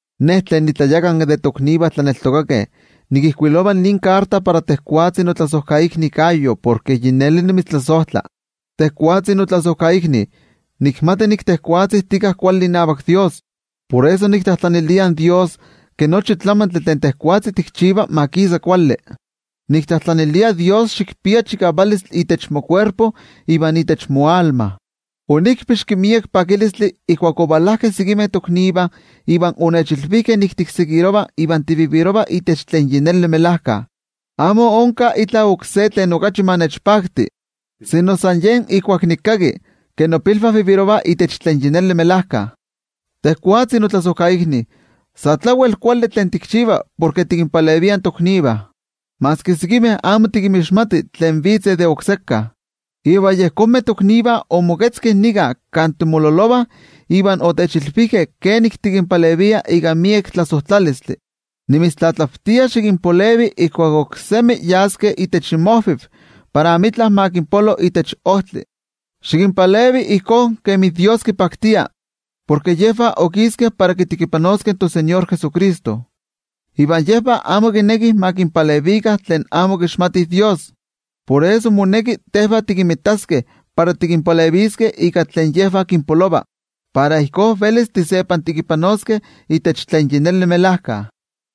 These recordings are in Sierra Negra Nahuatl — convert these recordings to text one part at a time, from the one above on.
Ne, tlen nitlayakanki de toknivah tlaneltokakeh, nikijkuilova nin amatlajkuiloli para tejwatzi notlasojkaikni Gayo, porke yi neli nimitztlasojtla. Tejwatzi notlasojkaikni, nikmati nik tejwatzi tika kuali inavak toYejwatzi. Por eso niktlajtlanilia in toYejwatzi ke nochi tlamantli tlan tejwatzi tikchiva ma kisa kuali. Niktlajtlanilia xikpia chikavalistli itech mokuerpo iva itech moanima. Onikpixki miek pakilistli ijkuak ovalajkeh sekimeh toknivah iva onechilvijkeh ke tikseguirova iva tinemi itech tlen melajkayotl. Amo onka itla oksé tlen okachi ma nechpakti, sino san yen ijkuak nikkaki ke nopilvah nemih itech tlen melajkayotl. Tejwatzi notlasojkaikni, sa tlawel kuali tlen tikchiva porke tikinpalevia toknivah, maski sekimeh amo tikinmixmati tlen vitzeh de okseka. Iva yejonmeh toknivah omoketzkeh nika kan timololovah iva otechilvijkeh kenik tikinpalevia ika miek tlasojtlalistli. Nimitztlatlavtia, xikinpalevi ijkuak oksemi yaskeh itech inmojvi para amitla ma kinpolo itech ojtli, xikinpalevi ijkó kemi toYejwatzi kipaktia. Porke yejvah okiskeh para kitekipanoskeh toTeko Jesucristo, iva yejvah amo kinekih ma kinpalevikah tlen amo kixmati Dios. Por eso moneki tejvah tikinmitaskeh para tikinpaleviskeh ika tlen yejvah kinpolova, para ijkó velis tisepantekipanoskeh itech tlen melajkayotl.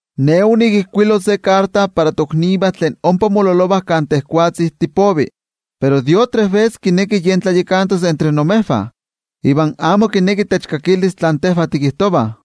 Ne onikijkuilo se amatlajkuiloli para toknivah tlen ompa mololovah kan tejwatzi tipovi, pero Diótrefes kineki yen tlanavatijtos entre imejvah, iva amo kineki techkakilis tlen tejvah tikijtovah.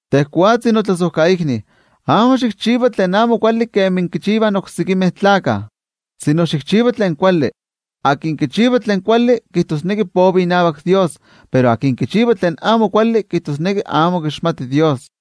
Tejwatzi notlasojkaikni, amo xikchiva tlen amo kuali kemi kichivah in oksekimeh tlakah, sino xikchiva tlen kuali. Tlen kichiva tlen kuali kijtosneki povi inavak toYejwatzi, pero tlen kichiva tlen amo kuali kijtosneki amo kixmati in toYejwatzi.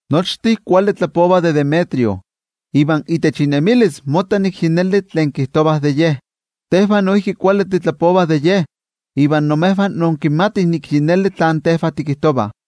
Nochtin kuali tlapovah de Demetrio, iva itech inemilis motta nik yi neli tlen kijtovah de ye. Tejvah noijki kuali titlapovah de ye, iva imejvah inkimatih nik yi neli tlen tejvah tikijtovah.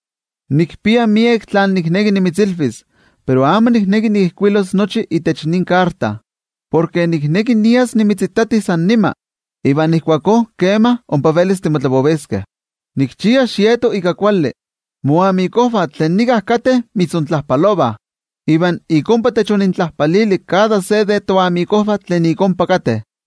Nikpia miek tlen nikneki nimitzilvis, pero amo nikneki nikijkuilos nochi itech nin amatlajkuiloli. Porke nikneki nias nimitzitati san nima, iva ijkuakó ompa velis timotlapoviskeh. Nikchia xieto ika kuali. Moyoliknivah tlen nika kateh mitzontlajpalovah. Iva ik ompa techonintlajpalili kada se de toyoliknivah tlen ik ompa kateh.